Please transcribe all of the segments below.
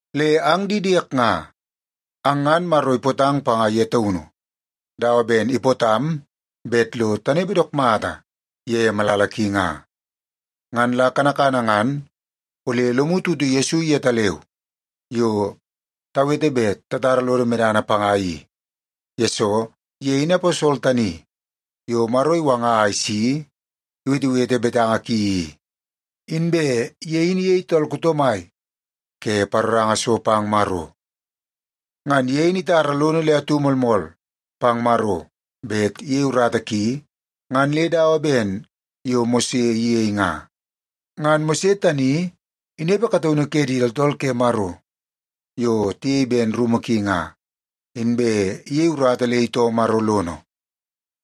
Le ang di diek nga, ang ngan Maro ipootang panga ye taunu dawa ben ipootam bet lo tanepe dook mata ye malala ki nga. Ngan la kanakana ngan ole lomu tutu Yesu yetaleu yo tawete bet tatara lodo medana panga i, yesoo ye in aposol tani yo Maro iwanga a isi iwetewete betanga ki i, inbe ye in iyei tool kuto mai ke paroranga so pang Maro. Ngan ye in itara lono le atu moolmool pang Maro bet iyei urata ki ngan le dawa ben yo Mose iyei nga. Ngan Mose tani inepe kataunu ke di tooltool ke Maro yo tiyei ben rumu ki nga, inbe iyei urata le itoo Maro lono.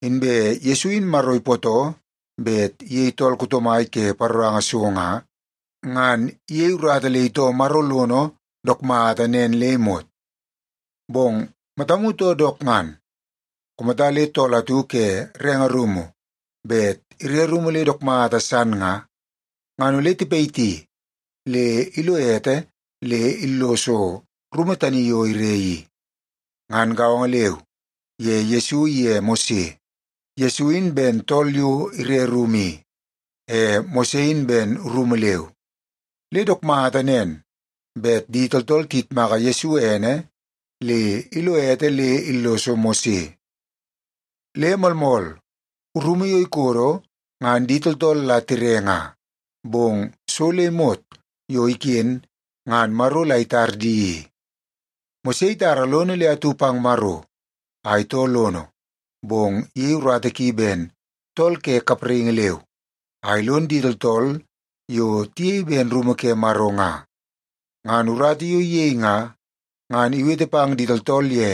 Inbe Yesu in Maro ipootoo bet iyei tool kuto mai ke paroranga so nga, ngan iyei urata le itoo Maro lono dook mata nen le imot. Bong matamu too dook ngan, kumata le tool atu ke renge rumu bet ire rumu le dook mata san nga, ngan ole tipayiti le ilo ete le illoso rumu tani yo ire i. Ngan gaongo leu ye Yesu iye Mose, Yesu in ben tool yo ire rumu i, e Mose in ben rumu leu, le dook mata nen bet di tooltool tiyitmaka Yesu ene le ilo ete le illoso Mose. Le moolmool, rumu yo ikodo ngan di tooltool la tire nga, bong so le imot yo iken ngan Maro la itar di i. Mose itara lono le atu pang Maro a itoo lono, bong iyei urata ki ben tool ke kapraingi leu, a ilon di tooltool yo tiyei ben rumu ke Maro nga. Ngan urata yo iyei nga, ngan iwete pang di tooltool ye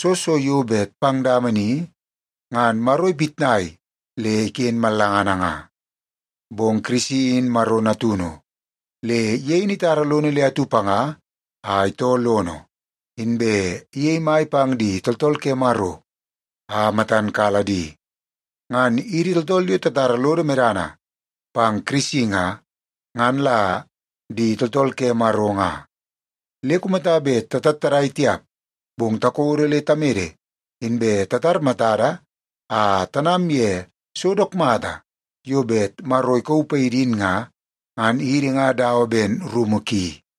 soo so yo bet pang dama ni ngan Maro ipitnai le iken mallanga nga. Bong Kirisi in Maro Natunu, le ye in itara lono le atu panga a itoo lono, inbe iyei mai pang di tooltool ke Maro a matan kala di. Ngan idi tooltool yo tatara lodo medana pang Kirisi nga, ngan la di tooltool ke Maro nga. Le kumata bet tatattadai tiap, bong takodo le tamede, inbe tatar matada a tanam ye so dook mata yo bet Maro ikauu paidi in nga, ngan idi nga dawa ben rumu ki.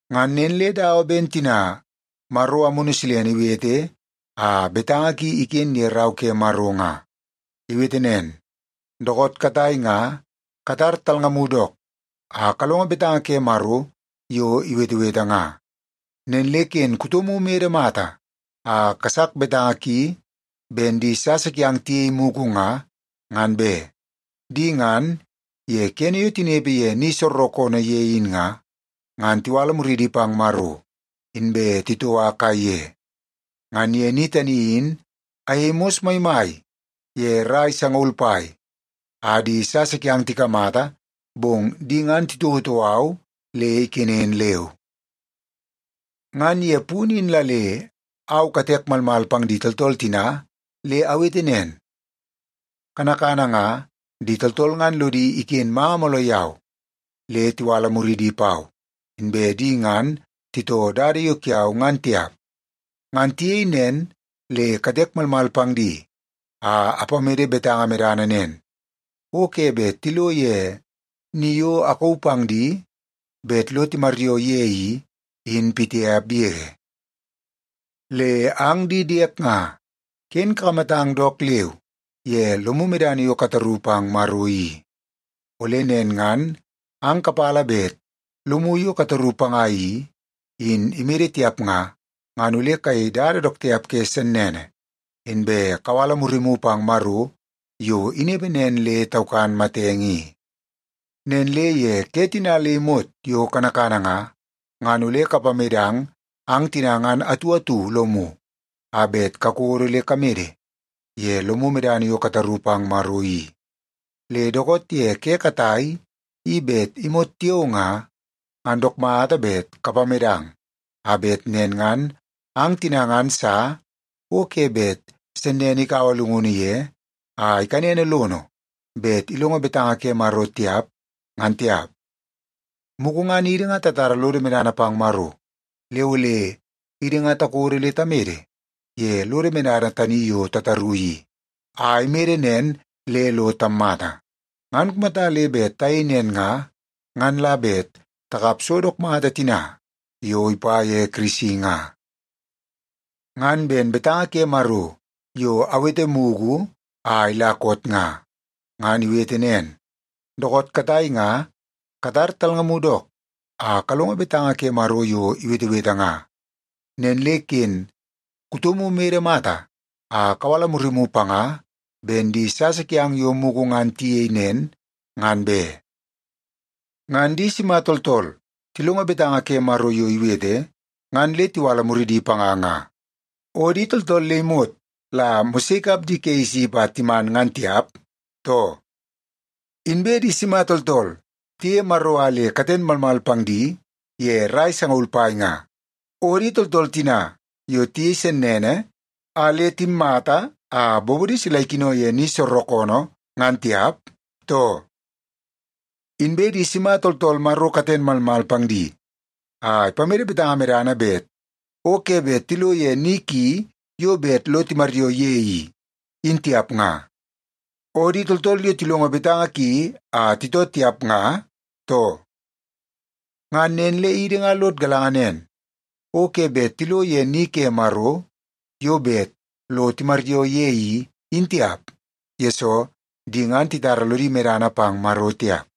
Ngan nen le dawa ben tina Maro Amunu Silene iwete a betanga ki iken ye Rau ke Maro nga. Iwete nen, “Dookoot katai nga katar talngamu dook, a kalongo betanga ke Maro yo iwetewete nga. Nen le ken kutomu imede mata a kasak betanga ki ben di sasa kiang tiyei mugu nga, ngan be. Di ngan, ye kene yo tinepe ye ni soorookoonoo ye in nga, ngan tiwala muridi pang Maro inbe titoua kaiye. Ngan ye ni tani in ayei mos maimai ye rai sangaul pai, a di sasa kiang tikamata, bong di ngan titouotou au le ikenen leu. Ngan ye punu in la le au katek malmal pang di tooltool tina, le awete nen, ‘Kanakana nga, di tooltool ngan lodi iken manga mooloo yau, le tiwala muridi pau, inbe di ngan titoo dada yo kiau ngan tiap.’ Ngan tiyei nen le katek malmal pang di a apamede betanga medana nen, ‘O ke bet tilo ye ni yo akauu pang di bet lo timaryoo ye i, in pitiap yege.’” Le ang di diek nga, ken kakamatang dook leu ye lomu medana yo kataru pang Maro i. Ole nen ngan ang kapala bet lomu yo kataru panga i, in imede tiap nga, ngan ole kayei dada dook tiap ke sennene, inbe kawala murimu pang Maro yo inepe nen le taukan matenge i. Nen le ye ke tina le imot yo kanakana nga, ngan ole kapamedang ang tina ngan atu atu lomu a bet kakodo le kamede ye lomu medana yo kataru pang Maro i. Le dookoot ye ke katai, i bet imot tiao nga, ngan dook mata bet kapamedang, a bet nen ngan ang tina ngan sa o ke bet sennene ikaua llungunu ye a ikanene lono bet ilongo betanga ke Maro tiap, ngan tiap. Mugu ngan idi nga tatara lodo medana pang Maro, le ole idi nga takodo le tamede ye lodo medana tani yo tataru i, a imede nen le lo tammata. Ngan kumata le bet tayei nen nga, ngan la bet takap so dook mata tina yo ipa ye Kirisi nga. Ngan ben betanga ke Maro yo awete mugu a ila koot nga, ngan iwete nen, “Dookoot katai nga katar talngamu dook, a kalongo betanga ke Maro yo iwetewete nga. Nen le ken kutomu imede mata a kawala murimu panga ben di sasa kiang yo mugu ngan tiyei nen, ngan be.” Ngan di sima tooltool tilongo betanga ke Maro yo iwete ngan le tiwala muridi panga nga? O di tooltool le imot la Mose ikap di ke Isip a timan ngan tiap, too? Inbe di sima tooltool tiyeie Maro a le katen malmal pang di ye rai sangaul pai nga? O di tooltool tina yo tiyei sennene, a le timmata a bobodi sila ikino ye ni soorookoonoo ngan tiap, too? Inbe di sima tooltool Maro katen malmal pang di, a ipamede betanga medana bet o ke bet tilo ye ni ki yo bet lo timaryoo ye i, in tiap nga? O di tooltool yo tilongo betanga ki a titoo tiap nga, too? Ngan nen le idi nga lod galanga nen, o ke bet tilo ye ni ke Maro yo bet lo timaryoo ye i, in tiap, yesoo di ngan titara lodi medana pang Maro tiap.